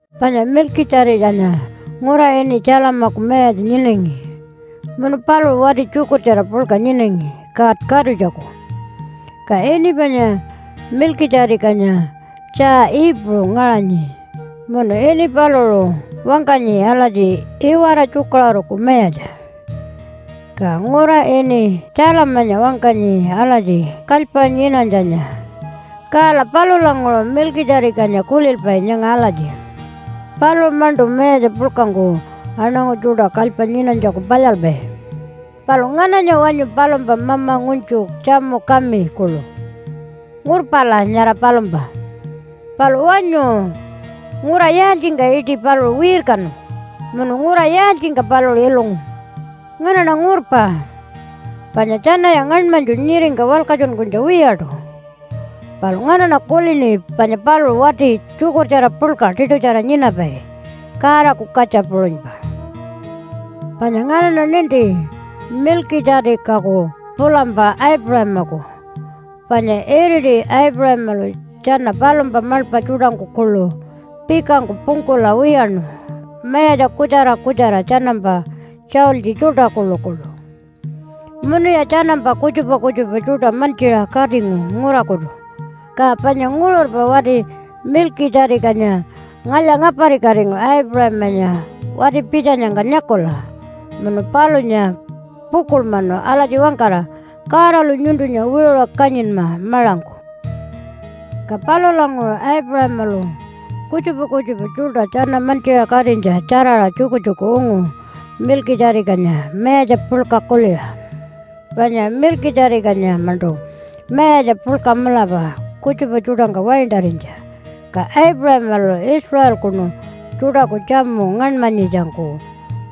Panya Milkitja-tikanya ngura ini Salemaku mayatja nyinangi munu paluṟu wati tjukurtjara puḻka nyinangi God Katutjaku. Ka ini panya Milkitja-tikanya tjaa Iipuṟu ngaṟanyi munu ini paluṟu wangkanyi alatji, Iwara tjukaṟuruku mayatja. Ka ngura ini Salemanya wangkanyi alatji, Kalypa nyinanytjanya. Kala palulanguṟu Milkitja-tikanya kulilpai nyanga alatji, “Paluṟu-maṉṯu mayatja puḻkangku aṉangu tjuṯa kalypa nyinanytjaku palyalpai.” Palu ngananya wanyu palumpa mama ngunytju, tjamu kami kuḻu? Ngurpala nyara palumpa. Palu wanyu ngura yaaltjingka iṯi paluṟu wirkanu? Munu ngura yaaltjingka paluṟu ilungu? Nganaṉa ngurpa. Panya tjanaya ngaṉmanytju nyiringka walkatjunkunytja wiyaṯu. Palu nganaṉa kulini panya paluṟu wati tjukurtjara puḻka tiṯutjara nyinapai, Godaku katja puṟunypa. Panya nganaṉa ninti Milkitja-tikaku pulampa Aipuṟamaku, panya iriti Aipuṟamalu tjana palumpa maḻpa tjuṯangku kuḻu pikangku pungkula wiyaṉu mayatja kutjara kutjara tjanampa tjaultji tjuṯa kuḻukuḻu. Munuya tjanampa kutjupa kutjupa tjuṯa mantjiṟa katingu ngurakutu. Ka panya nguṟurpa wati Milkitja-tikanya ngalya-ngaparikatingu Aipuṟamanya wati-pitjanyangka nyakula munu palunya pukuḻmanu alatji wangkara, “Godalu nyuntunya wiṟuṟa kanyinma maṟangku.” Ka palulanguṟu Aipuṟamalu kutjupa kutjupa tjuṯa tjana mantjiṟa katinytja tjaraṟa tjukutjuku ungu Milkitja-tikanya mayatja puḻka kuliṟa. Panya Milkitja-tikanya-maṉṯu mayatja puḻka mulapa kutjupa tjuṯangka waintarinytja, ka Aipuṟamalu Israelkunu tjuṯaku tjamu ngaṉmanyitjangku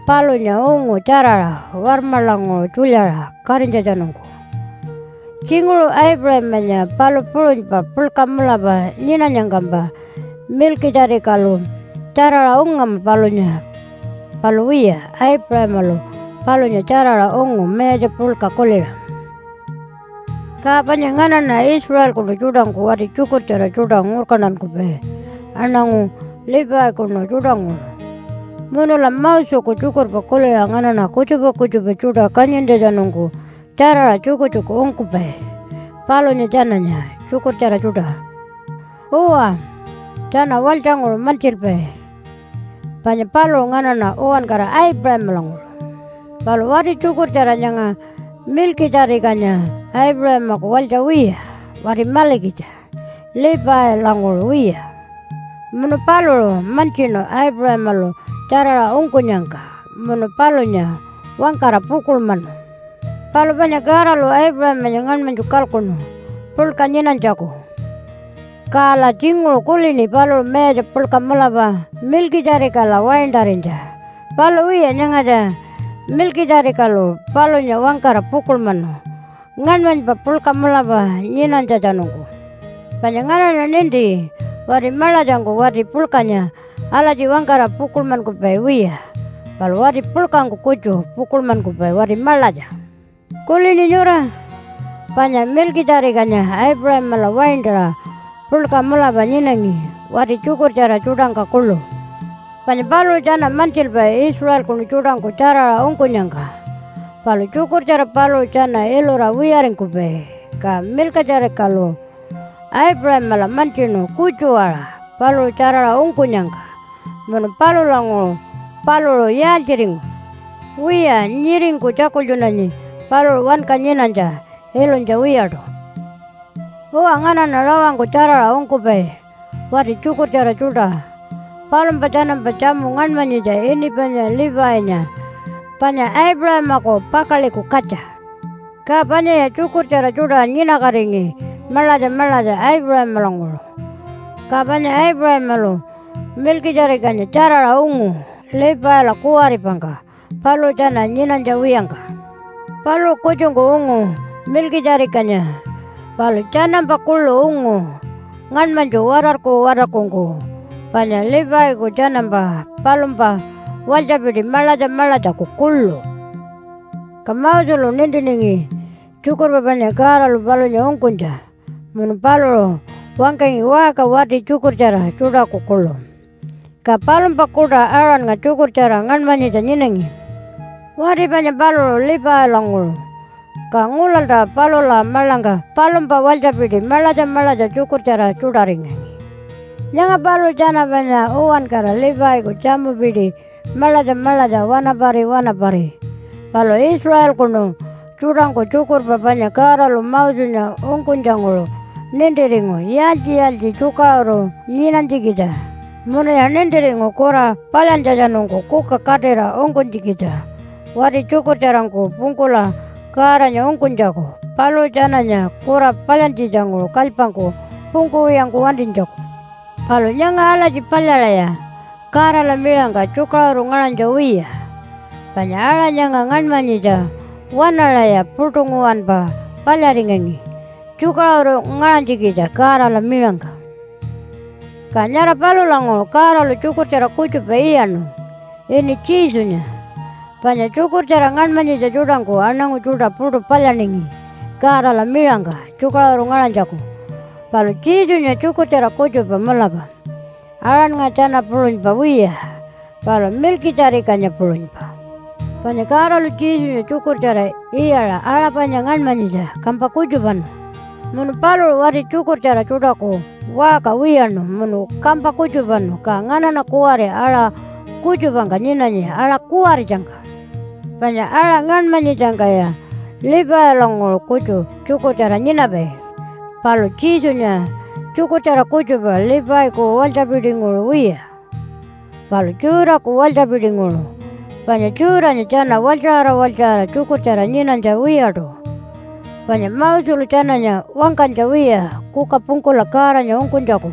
palunya ungu tjaraṟa warmaḻanguṟu tjulyaṟa katinytjatjanungku. Tjinguṟu Aipuṟamanya palu puṟunypa puḻka mulapa nyinanyangkampa Milkitja-tikalu tjaraṟa ungama palunya. Palu wiya, Aipuṟamalu palunya tjaraṟa ungu mayatja puḻka kuliṟa. Ka panya nganaṉa Israelkunu tjuṯangku wati tjukurtjara tjuṯa ngurkantankupai aṉangu Levikunu tjuṯanguṟu. Munula Moseku tjukurpa kuliṟa nganaṉa kutjupa kutjupa tjuṯa kanyintjatjanungku tjaraṟa tjukutjuku ungkupai palunya tjananya tjukurtjara tjuṯa. Uwa, tjana walytjanguṟu mantjilpai, panya paluṟu nganaṉa uwankara Aipuṟamalanguṟu. Palu wati tjukurtjara nyanga Milkitja-tikanya Aipuṟamaku walytja wiya, wati malikitja, Levilanguṟu wiya. Munu paluṟu mantjinu Aipuṟamalu tjaraṟa ungkunyangka, munu palunya wangkara pukuḻmanu. Palu panya Godalu Aipuṟamanya ngaṉmanytju kalkuṉu puḻka nyinanytjaku, kala tjinguṟu kulini paluṟu mayatja puḻka mulapa Milkitja-tikala waintarinytja. Palu wiya, nyangatja Milkitja-tikalu palunya wangkara pukuḻmanu ngaṉmanypa puḻka mulapa nyinanytjatjanungku. Panya nganaṉa ninti wati maḻatjangku wati puḻkanya alatji wangkara pukuḻmankupai wiya, palu wati puḻkangku kutju pukuḻmankupai wati maḻatja. Kulini nyura? Panya Milkitja-tikanya Aipuṟamala waintaṟa puḻka mulapa nyinangi, wati tjukurtjara tjuṯangka kuḻu. Panya paluṟu tjana mantjilpai Israelkunu tjuṯangku tjaraṟa ungkunyangka palu tjukurtjara paluṟu tjana ilura wiyaringkupai. Ka Milkitja-tikalu Aipuṟamala mantjinu kutju-aṟa paluṟu tjaraṟa ungkunyangka, munu palulanguṟu paluṟu yaaltjiringu? Wiya nyiringku tjakultjunanyi paluṟu wanka nyinanytja, ilunytja wiyaṯu. Uwa, nganaṉa rawangku tjaraṟa ungkupai wati tjukurtjara tjuṯa. Palumpa tjanampa tjamu ngaṉmanyitja ini panya Levinya, panya Aipuṟamaku pakaḻiku katja. Ka panyaya tjukurtjara tjuṯa nyinakatingi maḻatja maḻatja Aipuṟamalanguṟu. Ka panya Aipuṟamalu Milkitja-tikanya tjaraṟa ungu Levila kuwaripangka paluṟu tjana nyinanytja wiyangka. Paluṟu kutjungku ungu Milkitja-tikanya, palu tjanampa kuḻu ungu ngaṉmanytju watarku-watarkungku, panya Leviku tjanampa palumpa walytjapiti maḻatja maḻatjaku kuḻu. Ka Moselu nintiningi tjukurpa panya Godalu palunya ungkunytja, munu paluṟu wangkangi waṟka wati tjukurtjara tjuṯaku kuḻu. Ka palumpa kuṯa Aaronnga tjukurtjara ngaṉmanyitja nyinangi. Wati panya paluṟu Levilanguṟu. Ka ngulalta palula maḻangka palumpa walytjapiti maḻatja maḻatja tjukurtjara tjuṯaringangi. Nyanga paluṟu tjana panya uwankara Leviku tjamupiti maḻatja maḻatja wanapari wanapari. Palu Israelkunu tjuṯangku tjukurpa panya Godalu Mosenya ungkunytjanguṟu nintiringu yaaltji-yaaltji tjukaṟuru nyinanytjikitja, munuya nintiringu kura palyantjatjanungku kuka katira ungkunytjikitja wati tjukurtjarangku pungkula Godanya ungkunytjaku paluṟu tjananya kura palyantjitjanguṟu kalypangku pungkuwiyangku wantinytjaku. Palu nyanga alatji palyaṟaya Godala miṟangka tjukaṟuru ngaṟanytja wiya. Panya aṟa nyanga ngaṉmanyitja waṉaṟaya puṯu nguwanpa palyaringangi tjukaṟuru ngaṟanytjikitja Godala miṟangka. Ka nyara palulanguṟu Godalu tjukurtjara kutjupa iyaṉu ini Jesunya, panya tjukurtjara ngaṉmanyitja tjuṯangku aṉangu tjuṯa puṯu palyaningi Godala miṟangka tjukaṟuru ngaṟanytjaku. Palu Jesunya tjukurtjara kutjupa mulapa, Aaronnga tjana puṟunypa wiya, palu Milkitja-tikanya puṟunypa. Panya Godalu Jesunya tjukurtjara iyaṟa aṟa panya ngaṉmanyitja kampa kutjupanu. Munu paluṟu wati tjukurtjara tjuṯaku waṟka wiyaṉu munu kampa kutjupanu. Ka nganaṉa kuwari aṟa kutjupangka nyinanyi aṟa kuwaritjangka. Panya aṟa ngaṉmanyitjangkaya Levilanguṟu kutju tjukurtjara nyinapai, palu Jesunya tjukurtjara kutjupa Leviku walytjapitinguṟu wiya, palu Judah-ku walytjapitinguṟu. Panya Judah-nya tjana walytjaṟara walytjaṟara tjukurtjara nyinanytja wiyaṯu, panya Moselu tjananya wangkanytja wiya kuka pungkula Godanya ungkunytjaku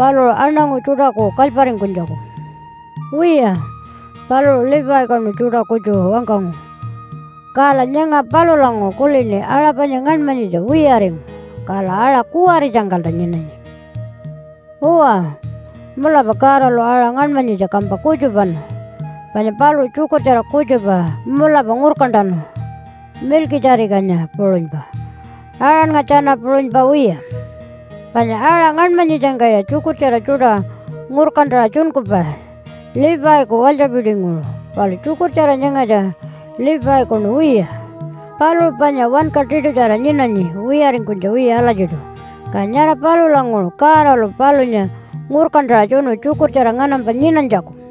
paluṟu aṉangu tjuṯaku kalyparingkunytjaku. Wiya, paluṟu Levikunu tjuṯa kutju wangkangu. Kala nyanga palulanguṟu kulini aṟa panya ngaṉmanyitja wiyaringu, kala aṟa kuwaritjangkalta nyinanyi. Uwa, mulapa Godalu aṟa ngaṉmanyitja kampa kutjupanu, panya paluṟu tjukurtjara kutjupa mulapa ngurkantanu Milkitja-tikanya puṟunypa, Aaronnga tjana puṟunypa wiya. Panya aṟa ngaṉmanyitjangkaya tjukurtjara tjuṯa ngurkantaṟa tjunkupai Leviku walytjapitinguṟu. Palu tjukurtjara nyangatja Levikunu wiya. Paluṟu panya wanka tiṯutjara nyinanyi wiyaringkunytja wiya alatjiṯu, ka nyara palulanguṟu Godalu palunya ngurkantaṟa tjunu tjukurtjara nganampa nyinanytjaku.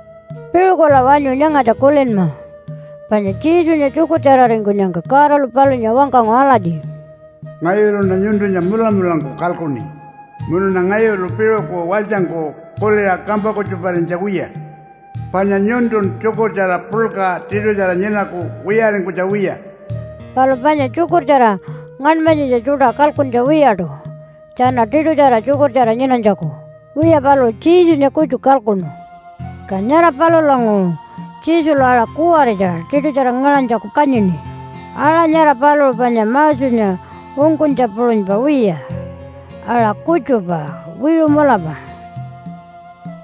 Piṟukula wanyu nyangatja kulinma! Panya Jesunya tjukurtjararingkunyangka Godalu palunya wangkangu alatji, “Ngayuluṉa nyuntunya mulamulangku kalkuṉi munuṉa ngayulu piṟuku walytjangku kuliṟa kampa kutjuparinytja wiya. Panya nyuntun tjukurtjara puḻka tiṯutjara nyinaku wiyaringkunytja wiya.” Palu panya tjukurtjara ngaṉmanyitja tjuṯa kalkuntja wiyaṯu tjana tiṯutjara tjukurtjara nyinanytjaku. Wiya, paluṟu Jesunya kutju kalkuṉu. Ka nyara palulanguṟu Jesulu aṟa kuwaritja tiṯutjara ngaṟanytjaku kanyini. Aṟa nyara paluṟu panya Mosenya ungkunytja puṟunypa wiya, aṟa kutjupa wiṟu mulapa.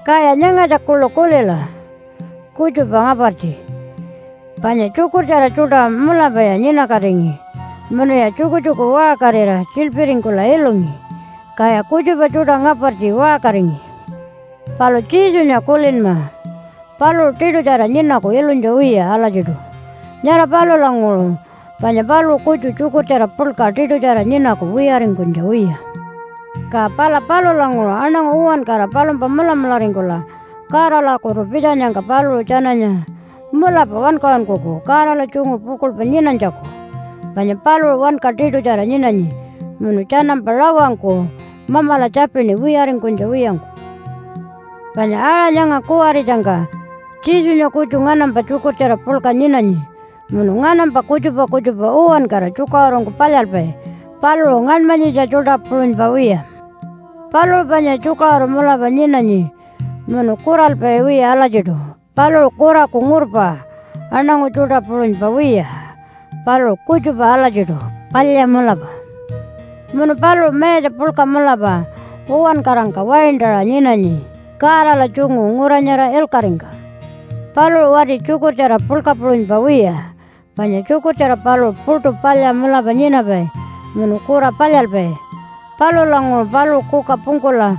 Kaya nyangatja kuḻu kulila kutjupa ngapartji. Panya tjukurtjara tjuṯa mulapaya nyinakatingi, munuya tjukutjuku waṟkarira tjiḻpiringkula ilungi, kaya kutjupa tjuṯa ngapartji waṟkaringi. Palu Jesunya kulinma paluṟu tiṯutjara nyinaku ilunytja wiya alatjiṯu. Nyara palulanguṟu panya paluṟu kutju tjukurtjara puḻka tiṯutjara nyinaku wiyaringkunytja wiya. Ka pala palulanguṟu aṉangu uwankara palumpa mulamularingkula Godalakutu pitjanyangka paluṟu tjananya mulapa wankaṟunkuku Godala tjungu pukuḻpa nyinanytjaku. Panya paluṟu wanka tiṯutjara nyinanyi munu tjanampa rawangku Mamala tjapini wiyaringkunytja wiyangku. Panya aṟa nyanga kuwaritjangka Jesunya kutju nganampa tjukurtjara puḻka nyinanyi munu nganampa kutjupa kutjupa uwankara tjukaṟurungku palyalpai. Paluṟu ngaṉmanyitja tjuṯa puṟunypa wiya. Paluṟu panya tjukaṟuru mulapa nyinanyi munu kuralpai wiya alatjiṯu. Paluṟu kuraku ngurpa aṉangu tjuṯa puṟunypa wiya. Paluṟu kutjupa alatjiṯu, palya mulapa. Munu paluṟu mayatja puḻka mulapa uwankarangka waintaṟa nyinanyi Godala tjungu ngura nyara ilkaṟingka. Paluṟu wati tjukurtjara puḻka puṟunypa wiya, panya tjukurtjara paluṟu puṯu palya mulapa nyinapai munu kura palyalpai. Palulanguṟu paluṟu kuka pungkula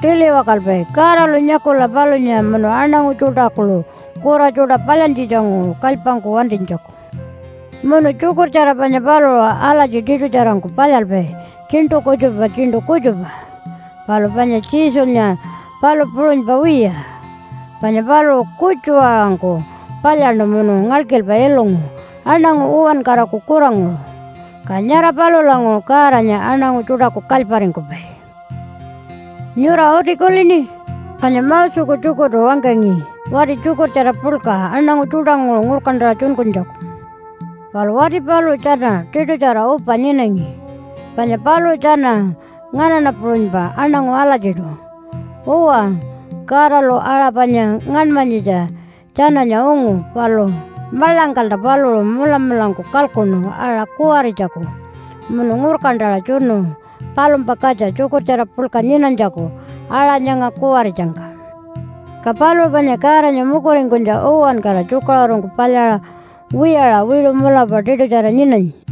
tiliwakalpai Godalu nyakula palunya munu aṉangu tjuṯa kuḻu kura tjuṯa palyantjitjanguṟu kalypangku wantinytjaku. Munu tjukurtjara panya paluṟu alatji tiṯutjarangku palyalpai tjiṉṯu kutjupa tjiṉṯu kutjupa. Palu panya Jesunya palu puṟunypa wiya, panya paluṟu kutju-aṟangku palyaṉu munu ngalkilpa ilungu aṉangu uwankaraku kuranguṟu, ka nyara palulanguṟu Godanya aṉangu tjuṯaku kalyparingkupai. Nyura uti kulini? Panya Moseku tjukurtu wangkangi wati tjukurtjara puḻka aṉangu tjuṯanguṟu ngurkantaṟa tjunkunytjaku. Palu wati paluṟu tjana tiṯutjara upa nyinangi, panya paluṟu tjana nganaṉa puṟunypa aṉangu alatjiṯu. Uwa, Godalu aṟa panya ngaṉmanyitja tjananya ungu, palu maḻangkalta paluṟu mulamulangku kalkuṉu aṟa kuwaritjaku, munu ngurkantaṟa tjunu palumpa katja tjukurtjara puḻka nyinanytjaku aṟa nyanga kuwaritjangka. Ka paluṟu panya Godanya mukuringkunytja uwankara tjukaṟurungku palyaṟa wiyaṟa wiṟu mulapa tiṯutjara nyinanyi.